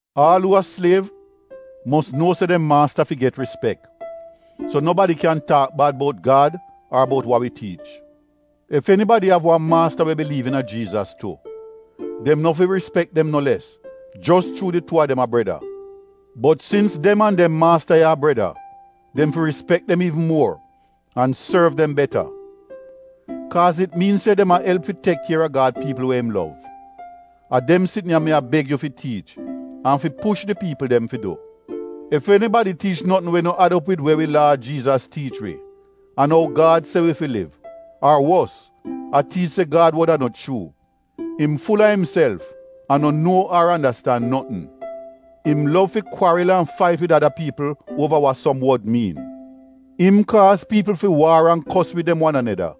Aal uu a sliev, mos nuo se dem maasta fi get rispek so nobadi kyan taak bad bout Gad ar bout wa wi tiich. Ef enibadi av wan maasta we biliiv iina Jiizas tu, dem no fi rispek dem no les jos chuu di tuu a dem a breda. Bot sins dem an dem maasta ya a breda, dem fi rispek dem iivn muor an sorv dem beta. Kaaz it miin se dem a elp fi tek kier a Gad piipl we im lov. A dem sitn ya mi a beg yu fi tiich an fi push di piipl dem fi du. Ef enibadi tiich notn we no ad op wid we wi Laad Jiizas tiich wi an ou Gad se wi fi liv, ar wos, a tiich se Gad wod a no chuu, im ful-a imself an no nuo ar andastan notn. Im lov fi kwaril an fait wid ada piipl uova wa som wod miin. Im kaaz piipl fi waar an kos wid dem wan aneda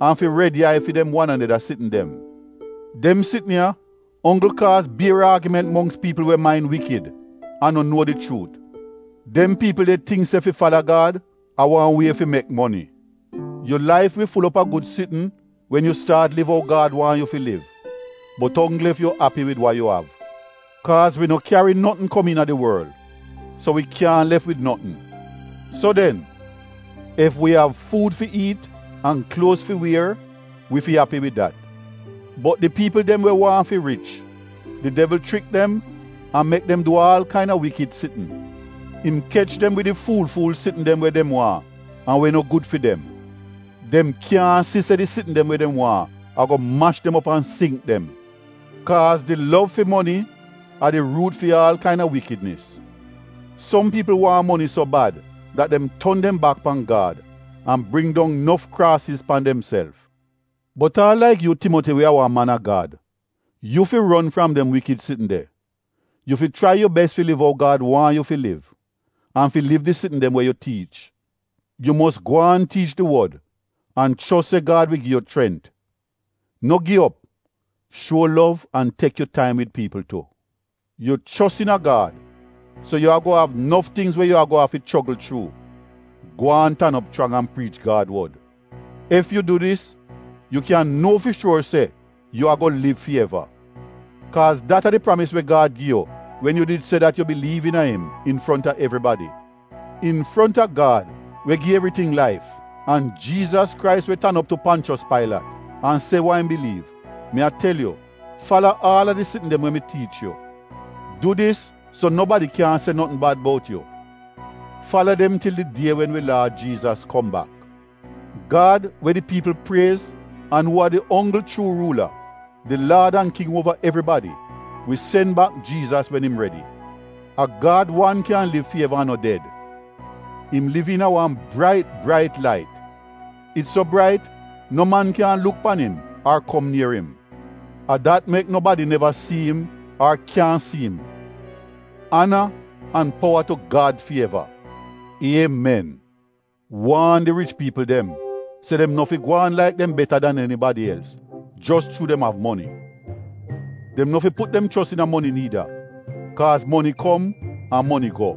an fi red yai fi dem wan aneda sitn dem. Dem sitn ya onggl kaaz bier aagiment mongks piipl we main wikid an no nuo di chuut. Dem piipl de tingk se fi fala Gad, a wan wie fi mek moni. Yu laif wi ful op a gud sitn wen yu staat liv ou Gad waahn yu fi liv, bot onggl ef yu api wid wa yu av. Kaaz wi no kyari notn kom iina di worl, so wi kyaahn lef wid notn. So den, ef wi av fuud fi iit an kluoz fi wier, wi fi api wid dat. Bot di piipl dem we waahn fi rich, di devl chrik dem an mek dem du aal kain-a wikid sitn. Im kech dem wid di fuul-fuul sitn dem we dem waahn an we no gud fi dem. Dem kyaahn si se di sitn dem we dem waahn a-go mash dem op an singk dem. Kaaz di lov fi moni a di ruut fi aal kain-a wikidnis. Som piipl waahn moni so bad dat dem ton dem bak pan Gad an bring dong nof kraasiz pan demself. Bot aal laik yu Timoti we a wan man a Gad, yu fi ron fram dem wikid sitn de. Yu fi chrai yu bes fi liv ou Gad waahn yu fi liv an fi liv di sitn dem we yu tiich. Yu mos gwaan tiich di Wod an chos se Gad wi gi yu chrent. No gi op, shuo lov an tek yu taim wid piipl tu. Yu chos iina Gad so yu a-go av nof tingz we yu a-go afi chogl chuu. Gwaan tan op chrang an priich Gad wod. Ef yu du dis yu kyan nuo fi shuor se yu a-go liv fi eva. Kaaz dat a di pramis we Gad gi yu wen yu did se dat yu biliiv iina im infronta evribadi. Infronta Gad we gi evriting laif an Jiizas Krais we tan op tu Ponchos Pailat an se wa im biliiv, mi a tel yu fala aal a di sitn dem we mi tiich yu. Du dis so nobadi kyaahn se notn bad bout yu. Fala dem til di die wen wi Laad Jiizas kom bak. Gad we di piipl priez an uu a di onggl chuu ruula, di Laad an King uova evribadi, wi sen bak Jiizas wen im redi. A Gad wan kyan liv fi eva an no ded. Im liv iina wan brait brait lait, it so brait no man kyaahn luk pan im ar kom nier im. A dat mek nobadi neva si im ar kyan si im. Ana an powa tu Gad fi eva! Iemen! Waan di rich piipl dem se dem no fi gwaan laik dem beta dan enibadi els jos chuu dem av moni. Dem no fi put dem chos iina moni niida kaaz moni kom an moni go.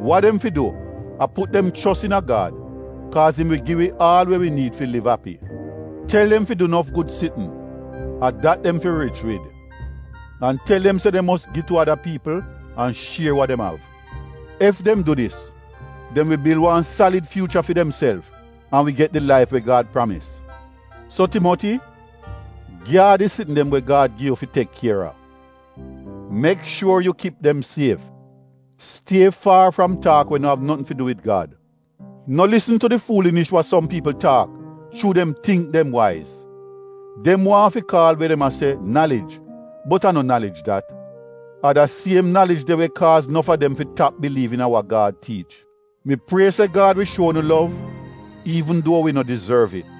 Wa dem fi du a put dem chos iina Gad kaaz im wi gi wi aal we wi niid fi liv api. Tel dem fi du nof gud sitn — a dat dem fi rich wid, an tel dem se dem mos gi tu ada piipl an shier wa dem av. Ef dem du dis, dem wi bil wan salid fyuucha fi demself an wi get di laif we Gad pramis. So Timoti, gyaad di sitn dem we Gad gi yu fi tek kier a. Mek shuor yu kip dem sief. Stie faar fram taak we no av notn fi du wid Gad. No lisn tu di fuulinish wa som piipl taak chuu dem tingk dem waiz. Dem waahn fi kaal we dem a se nalij bot a no nalij dat. A da siem nalij de we kaaz nof a dem fi tap biliiv iina wa Gad tiich. Mi prie se Gad wi shuo unu lov iivn duo wi no dizorv it.